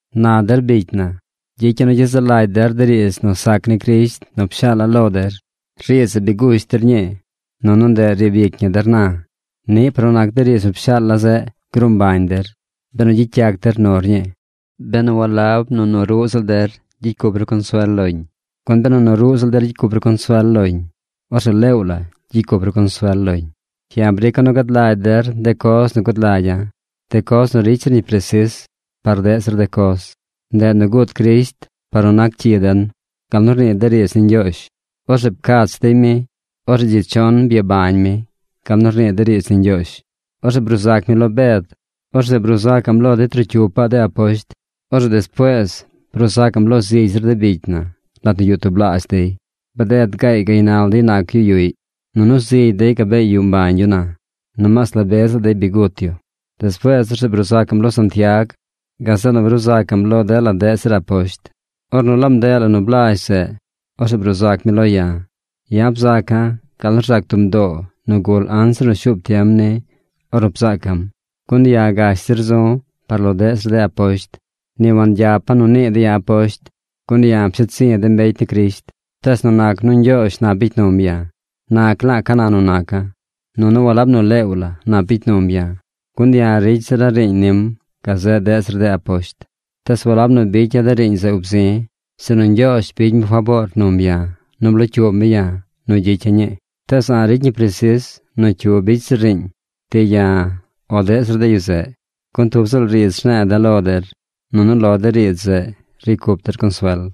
Na der bicy na, gyicya̱ nu gyezaꞌ lagy der de riidz nu sac ni Crisht nu pshaala̱ lo der. Riidz zeꞌ bi gush der ñii, nunu ndeꞌ riib ic ñi der na. Niꞌ par nu nac de riidz nu pshaala̱ zeꞌ, gruu mbañ der, benu gyicy yac der nur ñii, benu walab nu nu ruꞌ ziꞌl der gyicy cup ru consuel loñ. Gun benu nu ruꞌ ziꞌl der gyicy cup ru consuel loñ, orzeꞌ leew la gyicy cup ru consuel loñ. Ya̱ brica̱ nu gad lagy der de coz nu gud lagya̱, de coz nu ricy zir ñi presis par deꞌ zir de coz. Ndeꞌ nu gut Crisht par nu nac cyi den gal nu rnii de riidz ni Ñgyoozh. Orzeꞌ pcach dey mi. Orzeꞌ dzi chon byabañ mi gal nu rnii de riidz ni Ñgyoozh. Orzeꞌ bruu sac mi lo Bed. Orzeꞌ bruu sacaꞌm lo de trocyupaꞌ de aposht. Orzeꞌ despuees bruu sacaꞌm lo zigy zir de bicy na lat nu yuꞌ tublaazh dey. Bded gaay gaynal dey nac yu yuꞌy. Nunu zigy dey gabee yuꞌ mbañ yu na, nomaas la be ziꞌl dey bi gut yu. Despuees orzeꞌ bruu sac mi lo Santiag. Gazeꞌ nu bruu sac mi lo dela deꞌ zir aposht. Ornu laab ndeꞌ la nu blazh zeꞌ, orzeꞌ bruu sac mi lo ya̱. Ya̱ bzaca̱ gal nu rzac tub mdoo nu gul anzir nu shuub tiem ni ornu bzaaca̱m. Gun ya̱ gash zir zu̱ par lo deꞌ zir de aposht. Ni wangyapa̱ nu nii dey ya̱ aposht, gun ya̱ psheed zi̱ de mbecy ni Crisht. Tees nu nac nu Ñgyoozh nap bicy num ya̱, nac la̱a̱ ca na nu naca̱. Nunu walab nu leew la nap bicy num ya̱, gun ya̱ ricy zira̱ riiñ nim gazeꞌ deꞌ zir de aposht. Tees walab nu bicya̱ de riiñ zeꞌ ub zi̱, sinu Ñgyoozh bicy mi faboor num ya̱ nu blocyuub mi ya̱ nu gyicya̱ ñii. Tees a̱ꞌ ricy ñi presis nu cyu bicy zir riiñ: ti ya̱ o deꞌ zir de yu zeꞌ, gun tub ziꞌl riidz rne̱e̱ de̱ lo der, nunu lo de riidz zeꞌ ricy cup der consuel.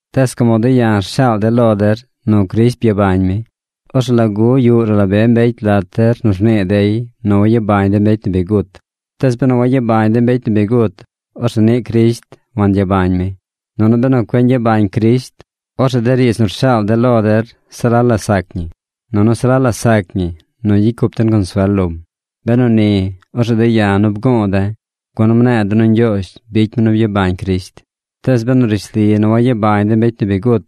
Tees como de̱ ya̱ rshaal de̱ lo der nu Crisht byabañ mi, orzeꞌ ¿lagu yuꞌ ruꞌ la be mbecy lat der nu rnii dey nu wayabañ de mbecy nu bi gut? Tees benu wayabañ de mbecy nu bi gut, orzeꞌ niꞌ Crisht wangyabañ mi. Nunu benu cueꞌ ñgyabañ Crisht, orzeꞌ de riidz nu rshaal de̱ lo der se la la sac ñi, nunu se la la sac ñi nu gyicy cup den consuel lom. Benu ni, orzeꞌ de̱ ya̱ nu bgu̱u̱ de̱, gun mne̱e̱ de̱ nu Ñgyoozh bicy mi nu byabañ Crisht. Tees benu rishli nu wayabañ de mbecy nu bi gut,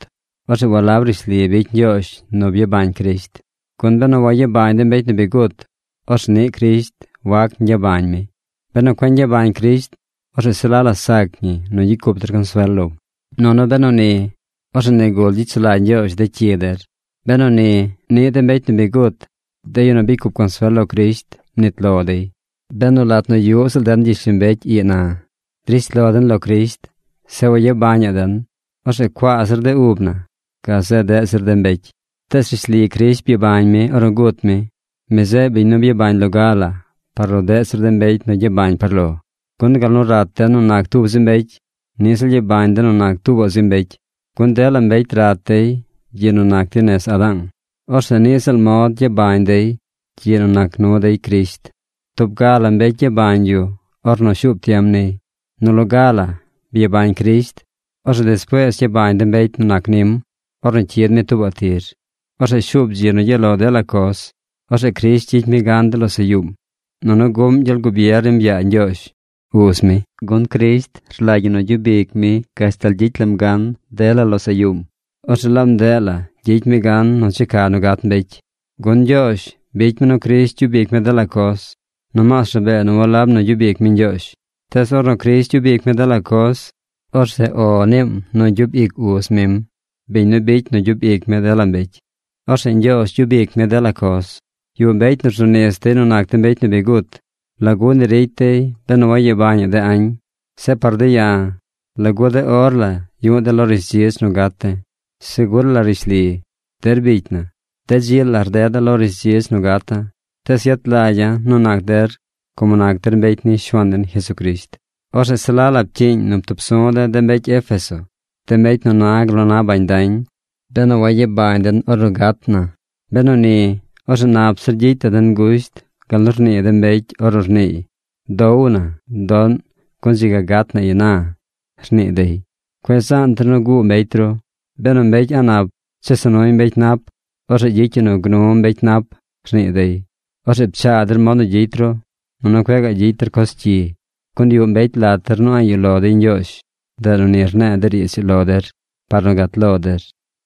orzeꞌ walab rishli bicy Ñgyoozh nu byabañ Crisht. Gun benu wayabañ de mbecy nu bi gut, orzeꞌ niꞌ Crisht wac ñgyabañ mi. Benu cueꞌ ñgyabañ Crisht, orzeꞌ se la la sac ñi nu gyicy cup der consuel lom, nunu benu ni, orzeꞌ nigul gyicy sulagy Ñgyoozh de cyi der. Benu ni, niꞌ de mbecy nu bi gut, de yu nu bicy cup consuel lo Crisht, mnit lo dey. Benu lat nu yuꞌ ziꞌl den gyishlombecy ii na, drish lo den lo Crisht, zeꞌ wayabañaꞌ den, orzeꞌ cuaa zir de ub na gazeꞌ deꞌ zir de mbecy. Tees rishli Crisht byabañ mi ornu gut mi. Mi zeꞌ biñ nu byabañ loga la par lo deꞌ zir de mbecy nu gyabañ par lo. Gun gal nu rat den nu nac tub zi mbecy, niꞌ ziꞌl gyabañ den nu nac tuubaꞌ zi mbecy. Gun dela mbecy rat dey gyiꞌ nu nac dey nez Adaang. Orzeꞌ niꞌ ziꞌl mod gyabañ dey gyiꞌ nu nac nu dey Crisht. Tub ga la mbecy gyabañ yu ornu shuup tiem niy. Nu loga la byabañ Crisht. Orzeꞌ despuees gyabañ de mbecy nu nac nim, ornu cyid mi tuubaꞌ tir. Orzeꞌ shuub dzi nu gyaꞌ lo dela coz. Orzeꞌ Crisht gyicy mi gan dela losaꞌ yuum, nunu guꞌm gyel gubier nim yaa Ñgyoozh, Uz mi. Gun Crisht rlagy ñi nu gyub ic mi gashtal gyicy lam gan dela losaꞌ yuum. Orzeꞌ laab ndeꞌ la gyicy mi gan nu checa nu gat mbecy. Gun Ñgyoozh bicy mi nu Crisht gyub ic mi dela coz. Nomaas rabee nu walab nu gyub ic mi Ñgyoozh. Tees ornu Crisht gyub ic mi dela coz, orzeꞌ “O” niim nu gyub ic Uz mim, biñ nu bicy nu gyub ic mi dela mbecy. Orzeꞌ Ñgyoozh gyub ic mi dela coz. Yuꞌ mbecy nu rzu nis dey nu nac de mbecy nu bi gut. ¿Lagu ni ricy dey benu wayabañaꞌ de añ? Zeꞌ par de̱ ya̱, ¿lagu de or la yu̱ꞌ de̱ lo rishdzidz nu gat de̱? Segur la rishli, der bicy na, de dzi la rdeda̱ lo rishdzidz nu gata̱. Tees yet lagya̱ nu nac der como nac der mbecy ni Shuaan den Jesucrisht. Orzeꞌ se la la pcyiiñ nu ptub su̱ de̱ de mbecy Éfeso, de mbecy nu na gal nu na bañ dañ, benu wayabañ den ornu gat na. Benu ni, orzeꞌ nap zir gyicy la den gusht gal nu rnii de mbecy ornu rniiy: “¡Dow na, doꞌn gun dzi ga gat na ina!”, rnii dey. Cueꞌ zaan der nu guu mbecy ru. “Benu mbecy a̱ꞌ nap chesa nuy mbecy nap, orzeꞌ gyicy yu nu gnu mbecy nap”, rnii dey. Orzeꞌ pchaa der mod nu gyicy ru, nunu cueꞌ gaꞌ gyicy der coz cyi. Gun yuꞌ mbecy lat der nu a̱ꞌ yuꞌ lo dey Ñgyoozh. Ndeꞌ nu ni rne̱e̱ de riidz ii lo der par nu gat lo der.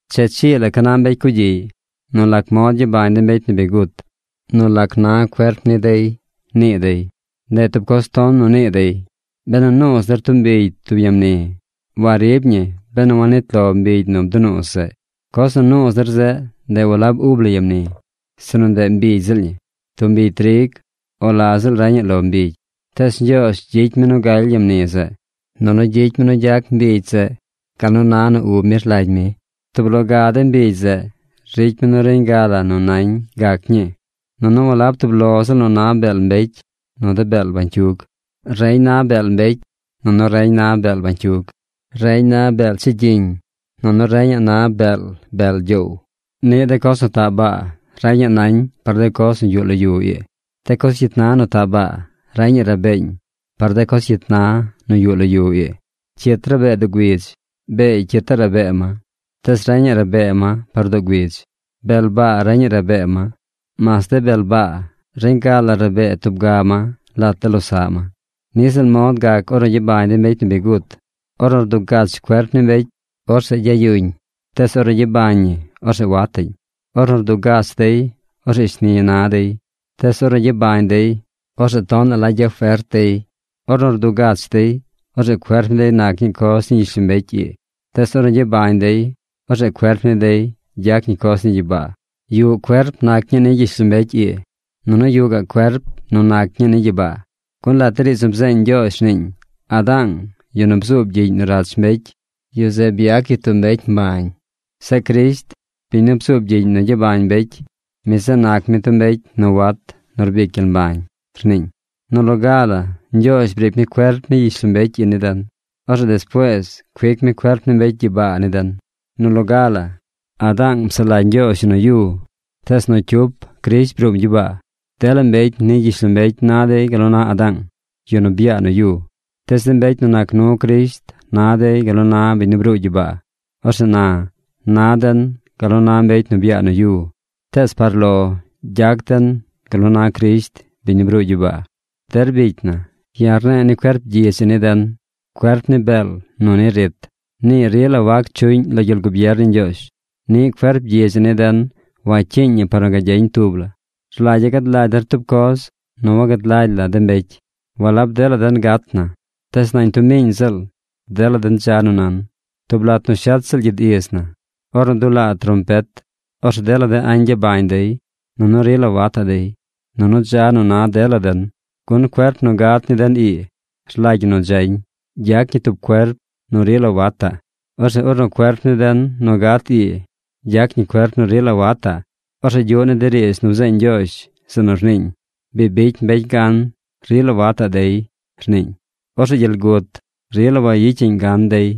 Che chii la ca na mbecy cugyiꞌy: “¿Nu lac mod gyabañ de mbecy nu bi gut? ¿Nu lac na cuerp ni dey?” nii dey. ¡Ndeꞌ tub coz ton nu nii dey! Benu nuuz der tub mbigy tub ya mni, warib ñi benu wanit lo mbigy nu bdunuuz zeꞌ. Coz nu nuuz der zeꞌ, ndeꞌ walab ub la ya mni, sinu ndeꞌ mbigy ziꞌl ñi: tub mbigy trig o la ziꞌl reñaꞌ lo mbigy. Tees Ñgyoozh gyicy mi nu galy ya mni zeꞌ, nunu gyicy mi nu gyac mbigy zeꞌ gal nu na nu ub mi rlagy mi. Tub lo ga de mbigy zeꞌ ricy mi nu reñ ga la nu nañ gac ñii. Nunu walab tub ziꞌl nu na beel mbecy nu de beel bañcyug. Reñ na beel mbecy, nunu reñ na beel bañcyug. Reñ na beel chigyiñ nunu reñaꞌ na beel bel gyoow. Niꞌ de coz nu taꞌ baa, reñaꞌ nañ par de coz nu yuꞌ lo yu ii. De coz cyit na nu taꞌ baa reñaꞌ rabeeñ par de coz cyit na nu yuꞌ lo yu ii. Cyit rabee doo güidz. Beey cyitaꞌ rabee ma. Tees reñaꞌ rabee ma par doo güidz. Bel baa reñaꞌ rabee ma. Mas de bel baa, reñ ga la rabee tub ga ma lat de losaꞌ ma. Niꞌ ziꞌl mod gac ornu gyabañ de mbecy nu bi gut. Ornu rdugach cuerp ni mbecy, orzeꞌ gyayuñ. Tees ornu gyabañ ñi orzeꞌ wataꞌñ. Ornu rdugach dey, orzeꞌ shni na dey; tees ornu gyabañ dey, orzeꞌ tonaꞌ la gyafert dey. Ornu rdugach dey, orzeꞌ cuerp ni dey nac ñii coz ni gyishlombecy ii; tees ornu gyabañ dey, orzeꞌ cuerp ni dey gyac ñi coz ni gyibaa. Yuꞌ cuerp nac ñii ni gyishlombecy ii, nunu yuꞌ gaꞌ cuerp nu nac ñii ni gyibaa. Gun lat de riidz nu bzeeñ Ñgyoozh rniiñ: “Adaang, yu nu bzuub gyiꞌñ nu rach mbecy, yu zeꞌ byac yu tub mbecy mbañ. Zeꞌ Crisht, biñ nu bzuub gyiꞌñ nu gyabañ mbecy, mi zeꞌ nac mi tub mbecy nu wat nu rbic gyel mbañ”, rniiñ. Nu loga la Ñgyoozh briic mi cuerp ni gyishlombecy ii ni den. Orzeꞌ despuees cuic mi cuerp ni mbecy gyibaa ni den. Nu loga la, Adaang psaꞌ lagy Ñgyoozh yu nu yu. Tees nu cyup Crisht bruum gyibaa. Dela mbecy ni gyishlombecy na dey gal nu na Adaang, yu nu byaa nu yu, tees de mbecy nu nac nu Crisht na dey gal nu na biñ nu bruu gyibaa. Orzeꞌ na, na den gal nu na mbecy nu byaa nu yu, tees par lo gyac den gal nu na Crisht, biñ nu bruu gyibaa. Der bicy na, ya̱ rne̱e̱ ni cuerp gyidz ii ni den, cuerp ni beel nu ni rit, nii rila wac chuꞌñ lo gyel gubier ni Ñgyoozh. Niꞌ cuerp gyidz ii ni den wacyiiñ ñi par nu gagyeñ tub la. Rlagya̱ gad lagy der tub coz nu wagad lagy la de mbecy. Walab dela den gat na. Tees nañ tub miiñ ziꞌl dela den dza nu nan. Tub lat nu shet ziꞌl gyid iz na, ornu dulaa trompet, orzeꞌ dela de añ gyabañ dey, nunu rila wataꞌ dey. Nunu dza nu na dela den. Gun cuerp nu gat ni den ii rlagy ñi nu dzañ. Gyac ñi tub cuerp nu rila wataꞌ. Orzeꞌ ornu cuerp ni den nu gat ii gyac ñi cuerp nu rila wataꞌ, orzeꞌ gyuꞌ ni de riidz nu bzeeñ Ñgyoozh, zeꞌ nu rniiñ: “Bi bicy mbecy gan. Rila wataꞌ dey”, rniiñ. Orzeꞌ gyel gut rila wayicyaꞌñ gan dey.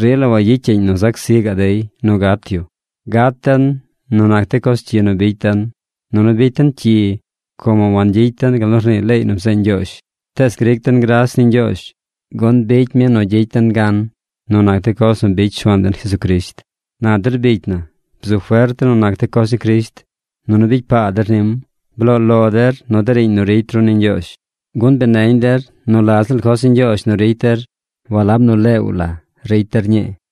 Rila wayicyaꞌñ nu zac zi gaꞌ dey nu gat yu. Gat den nu nac de coz cyi nu bicy den. Nunu bicy den cyi como wangyicy den gal nu rnii leey nu bzeeñ Ñgyoozh. Tees gric den gras ni Ñgyoozh, gun bicy mi nu gyicy den gan nu nac de coz nu bicy Shuaan den Jesucrisht. Na der bicy na, bzu fert der nu nac de coz ni Crisht, nunu bicy paa der nim. Bloo lo der nu de riiñ nu ricy ru ni Ñgyoozh, gun bi neñ der nu la ziꞌl coz ni Ñgyoozh nu ricy der walab nu leew la ricy der ñii.